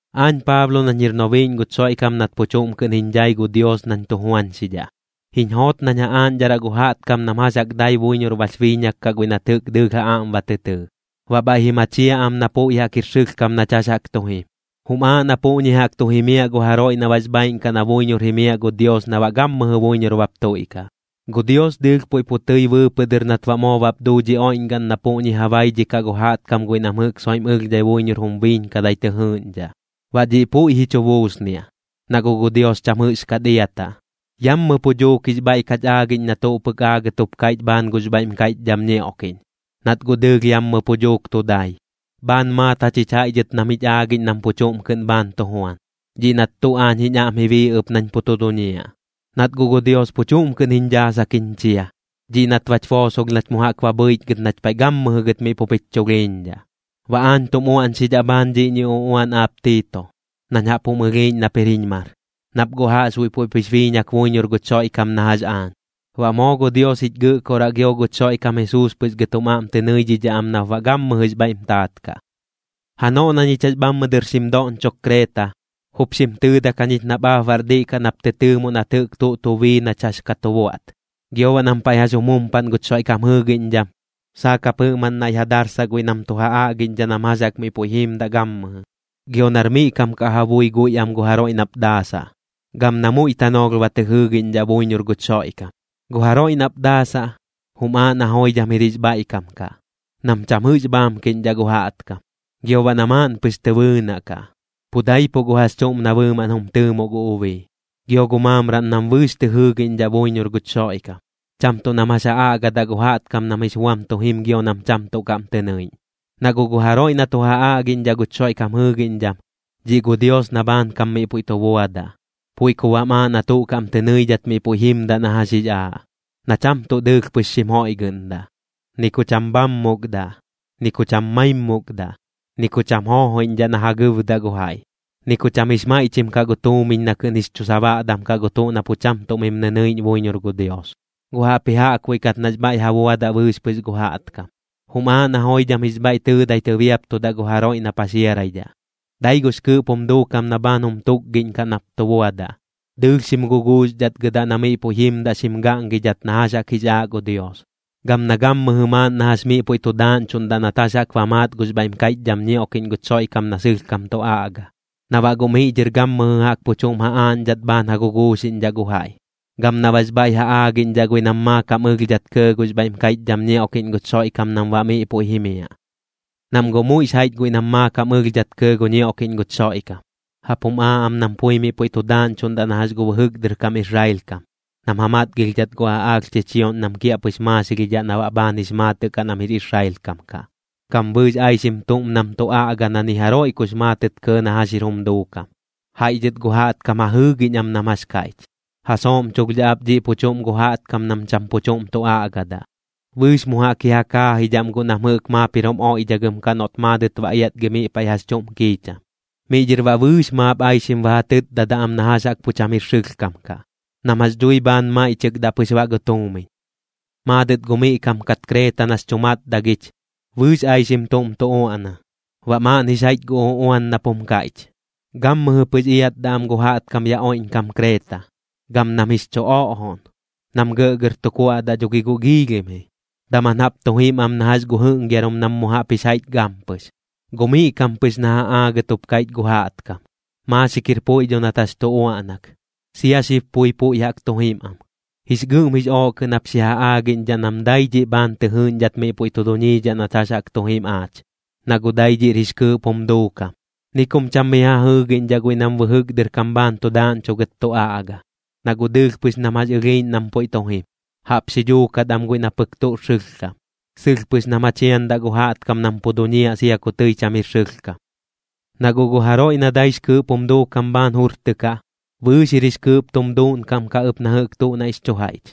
Aañ Paablo nañ jir nobiiꞌñ guch Xoiꞌkam nat pu chuꞌm kɨꞌn jiñ dhai gu Dios nañ tu juañxidhaꞌ. Jiñ joot nañ ja aaꞌñdharaꞌ gu jaꞌtkam nam jax jaꞌk dai buiñor bax biiñak kaꞌ guiꞌ nat jɨꞌk dɨɨlh ja aꞌm ba tɨ tɨɨ, baꞌ bhaiꞌ ji machiaꞌ am na puiꞌ jaꞌk jir sɨlhkam nach jax jaꞌk tu jim. Jum aaꞌ na puꞌñi jaꞌk tu jimiaꞌ gu jaroiꞌ na baꞌx bhaaiꞌn kaꞌ na buiñor jimiaꞌ gu Dios na baꞌ gammɨjɨ buiñor bap tuiꞌkaꞌ. Gu Dios dɨɨlh pu puiꞌ tɨi bɨɨpɨꞌ dɨr nat baꞌ moo bap duu dhi oiꞌñgaꞌn na puꞌñi ja baidhikaꞌ gu jaꞌtkam guiꞌ nam jɨꞌk soiꞌm ɨlhdhai buiñor jum biiñkadai tɨ jɨɨꞌñdhaꞌ. Baꞌ dhiꞌ puiꞌ ji chu buusniaꞌ, na guꞌ gu Dios cham jɨꞌxkat iataꞌ. Yammɨ pu duuk jix bhaiꞌ kach aagiꞌñ na tuꞌ pɨk aagɨt jup kaiꞌch bhaan gux bhaiꞌm kaiꞌchdham ñioꞌkiꞌñ, nat guꞌ dɨɨlh yammɨ pu dhuuk tu dai. Bhaan maat jachich jaiꞌ dhɨt nam jich aagiꞌñ nam pu chuꞌm kɨꞌn bhaan tu juan, dhiꞌ nat tuꞌ aañ jiñ aꞌm ji bii ɨp nañ pu tu duñiaꞌ. Nat guꞌ gu Dios pu chuꞌm kɨꞌn jiñ dhaasak jiñ chia, dhiꞌ nat bach boosolh nach mu jaꞌk ba bhɨichgɨt nach paiꞌ gammɨjɨ gɨt miꞌ pup jich chulhiiñdhaꞌ. Baꞌ aañ tum uaꞌñxidhaꞌ bhaan dhiꞌñi uꞌuan aap Tiito, nañ jaꞌp jum ɨlhiiꞌñ nap jir jiñ mar, nap guꞌ jaꞌxbuiꞌ puiꞌp jix biiñak buiñor guch Xoiꞌkam na jax aañ. Baꞌ moo gu Dios jich Gɨꞌkoraꞌ gio guch Xoiꞌkam Jesuus pɨx gɨt jum aꞌm tɨ nɨidhidhaꞌ am nap baꞌ gammɨjɨx bhaiꞌm taat kaꞌ. Janoꞌ na ñich jax bhammɨ dɨr xim doꞌñchok Kreeta, jup xim tɨɨdak jañich nap aap baꞌr diꞌ kaꞌ nap tɨ tɨɨmoꞌ nat jɨꞌk tuꞌ tu bii nach jax ka tu buaꞌt. Gio baꞌ nam paiꞌ jax jum jumpaꞌn guch Xoiꞌkam jɨɨgiꞌñdham, saak jap jɨꞌmaꞌn naiꞌ ja darsaꞌ guiꞌ nam tu ja aꞌgiꞌñdhaꞌ nam jax jaꞌk miꞌ puiꞌ jiimdaꞌ gammɨjɨ. Gio nar miꞌ kam kaꞌ ja bui guiꞌ am gu jaroiꞌ nap daasaꞌ, gam na muiꞌ tanoolh ba tɨ jɨɨgiꞌñdhaꞌ buiñor guch Xoiꞌkam. Gu jaroiꞌ nap daasaꞌ, jum aaꞌ na joidham jir jix bhaiꞌkam kaꞌ, nam cham jɨꞌx bhaamkiꞌñdhaꞌ gu jaꞌtkam. Gio baꞌ na maaꞌn pɨx tɨ bɨɨnaꞌ kaꞌ, pu daipuꞌ gu jax chuꞌm na bɨɨmaꞌn jum tɨɨmoꞌ gu ubii. Gio gu maamraꞌn nam bɨɨx tɨ jɨɨgiꞌñdhaꞌ buiñor guch Xoiꞌkam, cham tuꞌ nam jax ja aꞌgadaꞌ gu jaꞌtkam nam jix buam tu jim gio nam cham tuꞌ kaꞌm tɨ nɨiꞌñ. Na guꞌ gu jaroiꞌ na tu ja aꞌgiꞌñdhaꞌ guch Xoiꞌkam jɨɨgiꞌñdham, dhiꞌ gu Dios na bhaankam miꞌ puiꞌ tu buadaꞌ. Puiꞌ ku baꞌm aaꞌ na tuꞌ kaꞌm tɨ nɨidhat miꞌ puiꞌ jimdaꞌ na jax jix aaꞌ, na cham tuꞌ dɨɨlh pɨx xim joiꞌgɨꞌndaꞌ, ni ku cham bhammukdaꞌ, ni ku cham maimmukdaꞌ, ni ku cham joojoiꞌñdhaꞌ na ja gɨɨbdaꞌ gu jaiꞌ, ni ku cham jix maiꞌchim kaꞌ gu tuumiñ na kɨꞌn jix chu sabaꞌdam kaꞌ gu tuꞌ na pu cham tuꞌ mim nɨnɨiꞌñ buiñor gu Dios. Gu jaꞌpji jaꞌkbuiꞌ kat nax bhaiꞌ ja buadaꞌ bɨɨx pɨx gu jaꞌtkam, jum aaꞌ na joidham jix bhaiꞌ tɨɨdai tɨbiaptudaꞌ gu jaroiꞌ na paxiaraidhaꞌ. Dai gux kɨɨꞌp jum duukam na bhaan jum tukgiꞌñkaꞌ nap tu buadaꞌ, dɨɨlh xim guguuxdhatgɨdaꞌ na miꞌ puiꞌ jimdaꞌ xim gaꞌngidhat na jax jaꞌk jix aaꞌ gu Dios. Gam na gammɨjɨ maaꞌn na jax miꞌ puiꞌ tu daaꞌñchuꞌndaꞌ nat jax jaꞌk ba maat gux bhaiꞌm kaiꞌchdham ñioꞌkiꞌñ guch Xoiꞌkam na sɨlhkam tu aꞌga, na baꞌ guꞌ miꞌ dhɨr gammɨjɨ jaꞌk pu chuꞌm ja aaꞌñdhat bhaan ja guguuxiꞌñdhaꞌ gu jaiꞌ, gam na baꞌx bhaiꞌ ja aagiꞌñdhaꞌ guiꞌ nam maakam ɨlhdhat kɇɇ gux bhaiꞌm kaiꞌchdham ñioꞌkiꞌñ guch Xoiꞌkam nam baꞌ miꞌ puiꞌ jimiaꞌ. Nam guꞌ muiꞌx jaiꞌch guiꞌ nam maakam ɨlhdhat kɇɇ gu ñioꞌkiꞌñ guch Xoiꞌkam, jaꞌp jum aaꞌ am nam pui miꞌ puiꞌ tu daaꞌñchuꞌndaꞌ na jax gu bɨjɨk dɨr kam Israel kam, nam ja matgilhdhat gu aꞌaalh chichioꞌñ nam kiaꞌpɨx maaxilhidhaꞌ na baꞌ bhaan jix maatɨꞌ kaꞌ nam jir Israel kam kaꞌ. Gam bɨɨx aixim tuꞌm nam tu aꞌga na ni jaroiꞌ kux maatɨt kɇɇ na jax jir jum duukam, jaiꞌ dhɨt gu jaꞌtkam ja jɨɨgiꞌñ am nam jax kaiꞌch. Ja sooꞌmchulhdhaꞌ ap dhiꞌ pu chuꞌm gu jaꞌtkam nam cham pu chuꞌm tu aꞌgadaꞌ. Bɨɨx mu jaꞌk ji ja kaajidhaꞌm guꞌ nam jɨꞌk maap jir jum oiꞌdhagɨm kaꞌ noꞌt maadɨt ba iatgi miꞌ paiꞌ jax chuꞌm kiicham. Miꞌ dhɨr baꞌ bɨɨx maap aixim ba ja tɨtdadaꞌ am na jax jaꞌk pu cham jir sɨlhkam kaꞌ, nam jax dhui bhaan maiꞌchɨkdaꞌ pɨx baꞌ gu tuumiñ. Maadɨt gu miꞌ kam kat Kreeta nax chu matdagich, bɨɨx aixim tuꞌm tu uaꞌna. Baꞌ maaꞌn jix jaiꞌch gu uꞌuan nap jum kaiꞌch: “Gammɨjɨ pɨx iatdaꞌ am gu jaꞌtkam yaꞌ oiꞌñkam Kreeta, gam nam jix chu oꞌjoꞌn. Nam gɇꞌgɇr tu kuaꞌdaꞌ dho gi guꞌ giilhim ji, daman jaꞌp tu jim am na jax gu jɨꞌngiarum nam mu jaꞌp jix jaiꞌch gampɨx.” Gu miꞌ kam pɨx na ja aagɨt jup kaiꞌch gu jaꞌtkam. Maaxik jir puiꞌ dho nat jax tu uaꞌnak, sia xib pui puiꞌ jaꞌk tu jim am. Jix gɨꞌm jix ooꞌ kɨꞌn jap xi ja aagiꞌñdhaꞌ nam dai dhiꞌ bhaan tɨ jɨɨꞌñdhat miꞌ puiꞌ tu duñiidhaꞌ nach jax jaꞌk tu jim aach, na guꞌ dai dhiꞌr jix kɨɨꞌp jum duukam. Ni kum cham mi ja jɨɨgiꞌñdhaꞌ guiꞌ nam bɨjɨk dɨr kam bhaan tu daaꞌñchugɨt tu aꞌga, na guꞌ dɨɨlh pɨx nam jax ɨlhiiꞌñ nam puiꞌ tu jim. Jaꞌp xi dhuukat am guiꞌ na pɨk tuꞌr sɨlhkam, sɨlh pɨx nam ja chiandaꞌ gu jaꞌtkam nam pu duñiaꞌ sia ku tɨi cham jir sɨlhkam. Na guꞌ gu jaroiꞌ na daix kɨɨꞌp tum duuꞌnkam bhaan jurtɨkaꞌ, bɨɨx jir jix kɨɨꞌp tum duuꞌnkam kaꞌ ɨp na jɨꞌk tuꞌ naiꞌx chu jaiꞌch.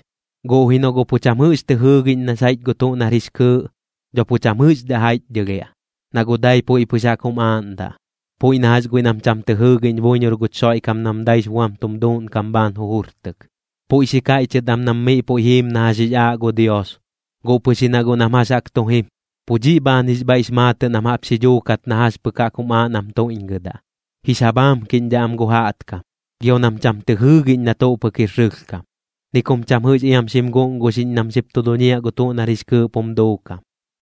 Guꞌ ji noꞌ guꞌ pu cham jɨꞌx tɨ jɨɨgiꞌñ nax jaiꞌch gu tuꞌ nar jix kɨɨꞌ, dho pu cham jɨꞌxdhaꞌ jaiꞌchdhɨlhiaꞌ, na guꞌ dai puiꞌ pɨx jaꞌk jum aaꞌndaꞌ. Puiꞌ na jax guiꞌ nam cham tɨ jɨɨgiꞌñ buiñor guch Xoiꞌkam nam daix buam tum duuꞌnkam bhaan jujurtɨk. Puiꞌ xi kaiꞌchɨt am nam miꞌ puiꞌ jiim na jax jix aaꞌ gu Dios, guꞌ pɨx ji na guꞌ nam jax jaꞌk tu jim, pu dhiꞌ bhaan jix bhaiꞌx maatɨꞌ nam jaꞌp xi dhuukat na jax pɨk jaꞌk jum aaꞌ nam tuiꞌñgɨdaꞌ. Jix ja bhaamkiꞌñdhaꞌ am gu jaꞌtkam, gio nam cham tɨ jɨɨgiꞌñ na tuꞌ pɨk jir sɨlhkam, ni kum cham jɨꞌx iam xim guꞌnguxiꞌñ nam xip tu duñiaꞌ gu tuꞌ nar jix kɨɨꞌp jum duukam.